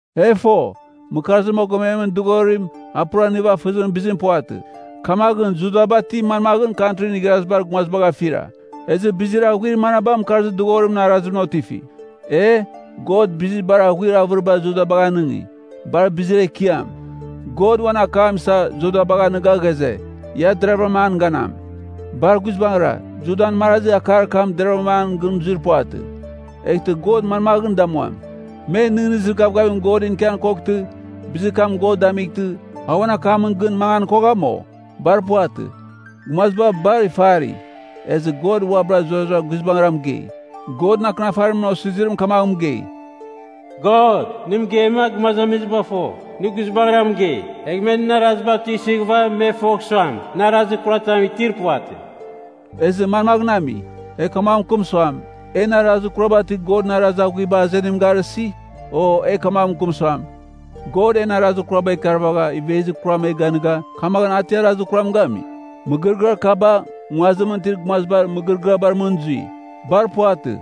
E fo, mɨkarzir mogomemɨn dɨghorim a pura nivafɨzimɨn bizim puvatɨ. Kamaghɨn Judaba ti manmaghɨn Kantrin Igharazibar Gumazibagh afira? Ezɨ bizir aghuir manaba mɨkarzir dɨghorimɨn arazimɨn otifi? E! God bizir bar aghuir avɨriba Judabagh anɨngi. Bar bizir ekiam, God uan akam isa Judabagh anɨga ghaze, ia deravɨra an ganam. Bar guizbangɨra, Judan marazi akar kam deravɨra an gɨn zuir puvatɨ. Eghtɨ God manmaghɨn damuam? Me nɨghnɨzir gavgavim Godɨn ikian koghtɨ, bizir kam God damightɨ, a uan akamɨn gɨn mangan kogham, o? Bar puvatɨ! Gumaziba bar ifari, ezɨ God uabɨra zurara guizbangɨra mɨgei. Godɨn Akɨnafarimɨn osizirim kamaghɨn mɨgei, “God, nɨ mɨgeima, gumazamiziba fo, nɨ guizbangɨra mɨgei. Egh me nɨn araziba tuisɨghɨva me fogh suam, nɨ arazir kuratam itir puvatɨ.” Ezɨ manmaghɨn ami? E kamaghɨn mɨkɨm suam, en arazir kuraba ti Godɨn arazir aghuiba azenim garɨsi? O, e kamaghɨn mɨkɨm suam, God en arazir kuraba ikarvagha ivezir kuraba e ganɨga, kamaghɨn a ti arazir kuram gami? (Mɨgɨrɨgɨar kaba, nguazimɨn itir gumazibar mɨgɨrɨgɨabar mɨn zui.) Bar puvatɨ!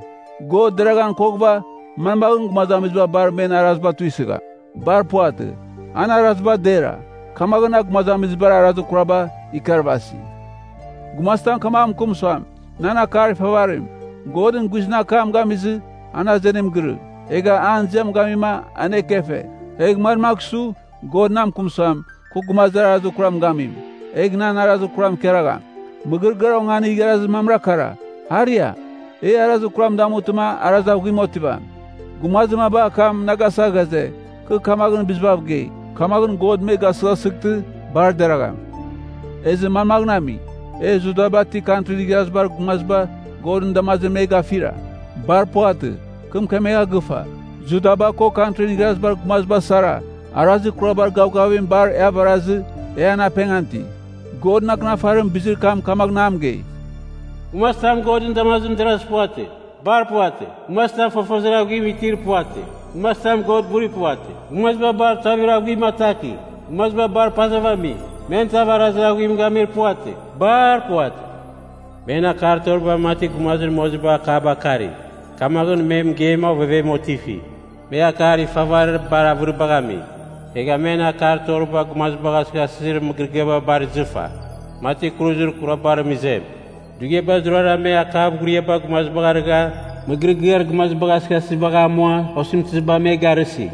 God deraghan koghɨva, manmaghɨn gumazamiziba bar men araziba tuisɨgham? Bar puvatɨ, an araziba dera, kamaghɨn a gumazamizibar arazir kuraba ikarvasi. Gumazitam kamaghɨn mɨkɨm suam, “Nan akar ifavarim, Godɨn guizɨn akam gamizɨ, an azenim girɨ, egha an ziam gamima an ekefe. Egh manmagh su, God na mɨkɨm suam, kɨ gumazir arazir kuram gamim, egh nan arazir kuram ikaragham?” Mɨgɨrɨgɨar onganir igharazir mamra kara: “Aria, e arazir kuram damutɨma arazir aghuim otivam.” Gumazir maba akam na gasa ghaze, kɨ kamaghɨn bizibav gei! Kamaghɨn God me gasɨghasɨghtɨ, bar deragham. Ezɨ manmaghɨn ami? E Judaba ti Kantrin Igharazibar Gumaziba Godɨn damazimɨn me gafira? Bar puvatɨ! Kɨ mɨkemegha gɨfa, Judaba ko Kantrin Igharazibar Gumaziba sara, arazir kurabar gavgavim bar e avarazɨ e an apengan iti. Godɨn Akɨnafarim bizir kam kamaghɨn a mɨgei, “Gumazitam Godɨn damazimɨn derazɨ puvatɨ. Bar puvatɨ. Gumazitam fofozir aghuim itir puvatɨ. Gumazitam God buri puvatɨ. Gumaziba bar tuavir aghuim ataki. Gumaziba bar pazav ami. Men tav arazir aghuim gamir puvatɨ. Bar puvatɨ. Men akar toriba mati gumazir moziba akaba akari; kamaghɨn me mɨgeima ovevem otifi. Me akar ifavarir bar avɨribagh ami. Egha men akar toriba gumazibagh asɨghasɨzir mɨgɨrɨgɨaba bar izɨfa, mati kuruzir kurabar imezim. Dughiaba zurara me akav ghuriaba gumazibagh arɨgha, mɨgɨrɨgɨar gumazibagh asɨghasɨsibagh amua osɨmtɨziba me garɨsi.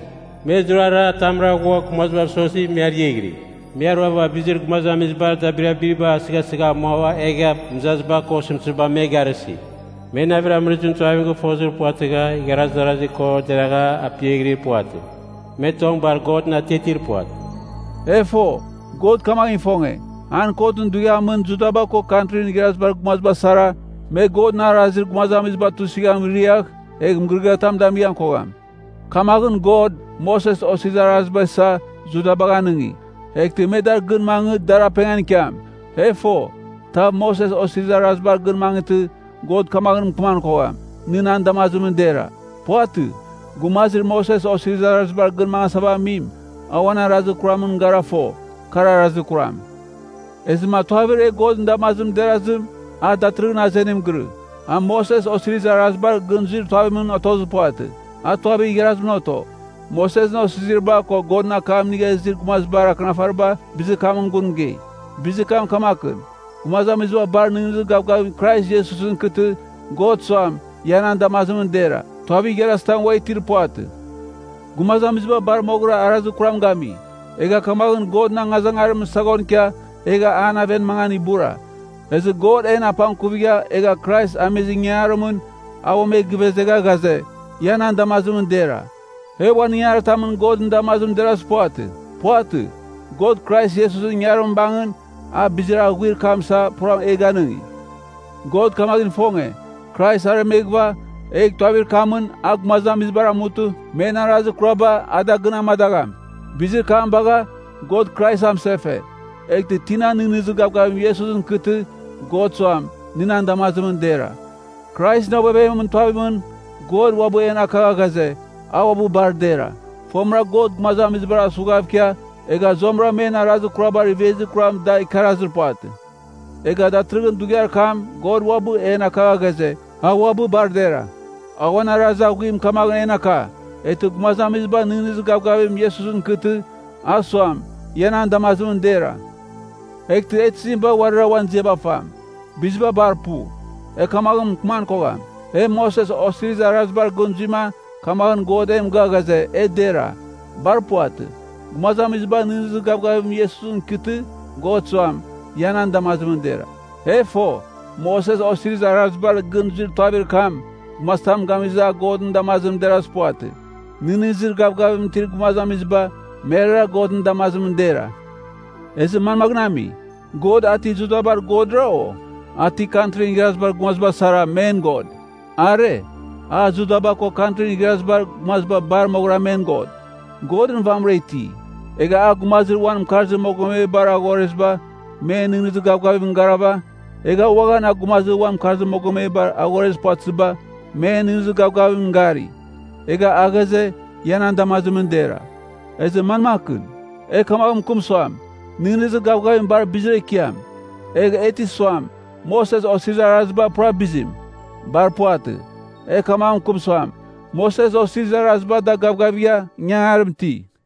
Me zurara atamra ghua gumazibav sozi, me ariaghɨri. Me aruava bizir gumazamizibar dabirabim gasɨghasɨzibagh amua, egha mɨzaziba ko osɨmtɨziba me garɨsi. Me navir amɨrɨzimɨn tuavim gɨfozir puvatɨgha igharaz darasi ko deragha apiaghɨri puvatɨ. Me tong bar Godɨn atiatir puvatɨ.” E fo, God kamaghɨn ifonge, an kotɨn dughiamɨn Judaba ko Kantrin Igharazibar Gumaziba sara, me Godɨn arazir gumazamiziba tuisɨzim riagh egh mɨgɨrɨgɨatam damighan kogham. Kamaghɨn God, Moses Osirizir Araziba isa, Judabagh anɨngi. Eghtɨ me dar gɨn mangɨ dar apengan ikiam. E fo, tav Moses Osirizir Arazibar gɨn mangɨtɨ, God kamaghɨn mɨkɨman kogham, nɨ nan damazimɨn dera. Puvatɨ. Gumazir Moses Osirizir Arazibar gɨn mangasava amim, a uan arazir kuramɨn gara fo, kar arazir kuram. Ezɨma tuavir e Godɨn damazimɨn derazim, a datɨrɨghɨn azenim girɨ. A Moses Osirizir Arazibar gɨn zuir tuavimɨn otozir puvatɨ. A tuavir igharazimɨn oto. Mosesɨn Osiziriba, ko Godɨn akam inigha izir gumazibar Akɨnafariba bizir kamɨn gun mɨgei. Bizir kam kamakɨn, gumazamiziba bar nɨghnɨzir gavgavim Krais Iesusɨn ikɨtɨ, God suam ia nan damazimɨn dera. Tuavir igharazitam ua itir puvatɨ. Gumazamiziba bar moghɨra arazir kuram gami, egha kamaghɨn Godɨn angazangarimɨn saghon ikia egha an aven mangan ibura. Ezɨ God en apangkuvigha egha Krais amizir ingangarimɨn a uam e givezegha ghaze, ia nan damazimɨn dera. E uan ingangaritamɨn Godɨn damazimɨn derazir puvatɨ. Puvatɨ. God Krais Iesusɨn ingarim bangɨn, a bizir aghuir kam isava pura e ganɨngi. God kamaghɨn ifonge, Krais aremeghɨva, egh tuavir kamɨn a gumazamizibar amutɨ, men arazir kuraba a da gɨn amadagham. Bizir kam bagha, God Krais amɨsefe. Eghtɨ tina nɨghnɨzir gavgavim Iesusɨn ikɨtɨ, God suam, nɨ nan damazimɨn dera. Kraisɨn ovevemɨn tuavimɨn, God uabɨ en akagha ghaze, a uabɨ bar dera. Fomɨra God gumazamizibar asughav ikia, egha zuamɨra men arazir kurabar ivezir kuram da ikarazir puvatɨ. Egha datɨrɨghɨn dughiar kam God uabɨ en akagha ghaze, a uabɨ bar dera. A uan arazir aghuim kamaghɨn en aka, eghtɨ gumazamiziba nɨghnɨzir gavgavim Iesusɨn ikɨtɨ, a suam, ia nan damazimɨn dera. Eghtɨ e tizim bagh uarira uan ziaba fam? Biziba bar pu. E kamaghɨn mɨkɨman kogham, e Moses Osirizir Arazibar gɨn zuima kamaghɨn God e mɨgɨa ghaze, e dera. Bar puvatɨ. Gumazamiziba nɨghnɨzir gavgavim Iesusɨn ikɨtɨ, God suam, ia nan damazimɨn dera. E fo, Moses Osirizir Arazibar gɨn zuir tuavir kam gumazitam gamizɨ, a Godɨn damazimɨn derazir puvatɨ. Nɨghnɨzir gavgavim itir gumazamiziba, merara Godɨn damazimɨn dera. Ezɨ manmaghɨn ami, God a ti Judabar Godra? O, a ti Kantrin Igharazibar Gumaziba sara, men God? Are. A Judaba ko Kantrin Igharazibar Gumaziba bar moghɨra men God. Godɨn vamɨra iti. Egha a gumazir uan mɨkarzir mogomebar aghoreziba, men nɨghnɨzir gavgavimɨn garava, egha uaghan a gumazir uan mɨkarzir mogomebar aghorezir puvatɨziba, men nɨghnɨzir gavgavimɨn gari. Egha a ghaze, ia nan damazimɨn dera. Ezɨ manmakɨn? E kamaghɨn mɨkɨm suam, nɨghnɨzir gavgavim bar bizir ekiam, egh e ti suam, Moses Osirizir Araziba pura bizim? Bar puvatɨ. E kamaghɨn mɨkɨm suam, Moses Osirizir Araziba da gavgavigha ingangarim iti.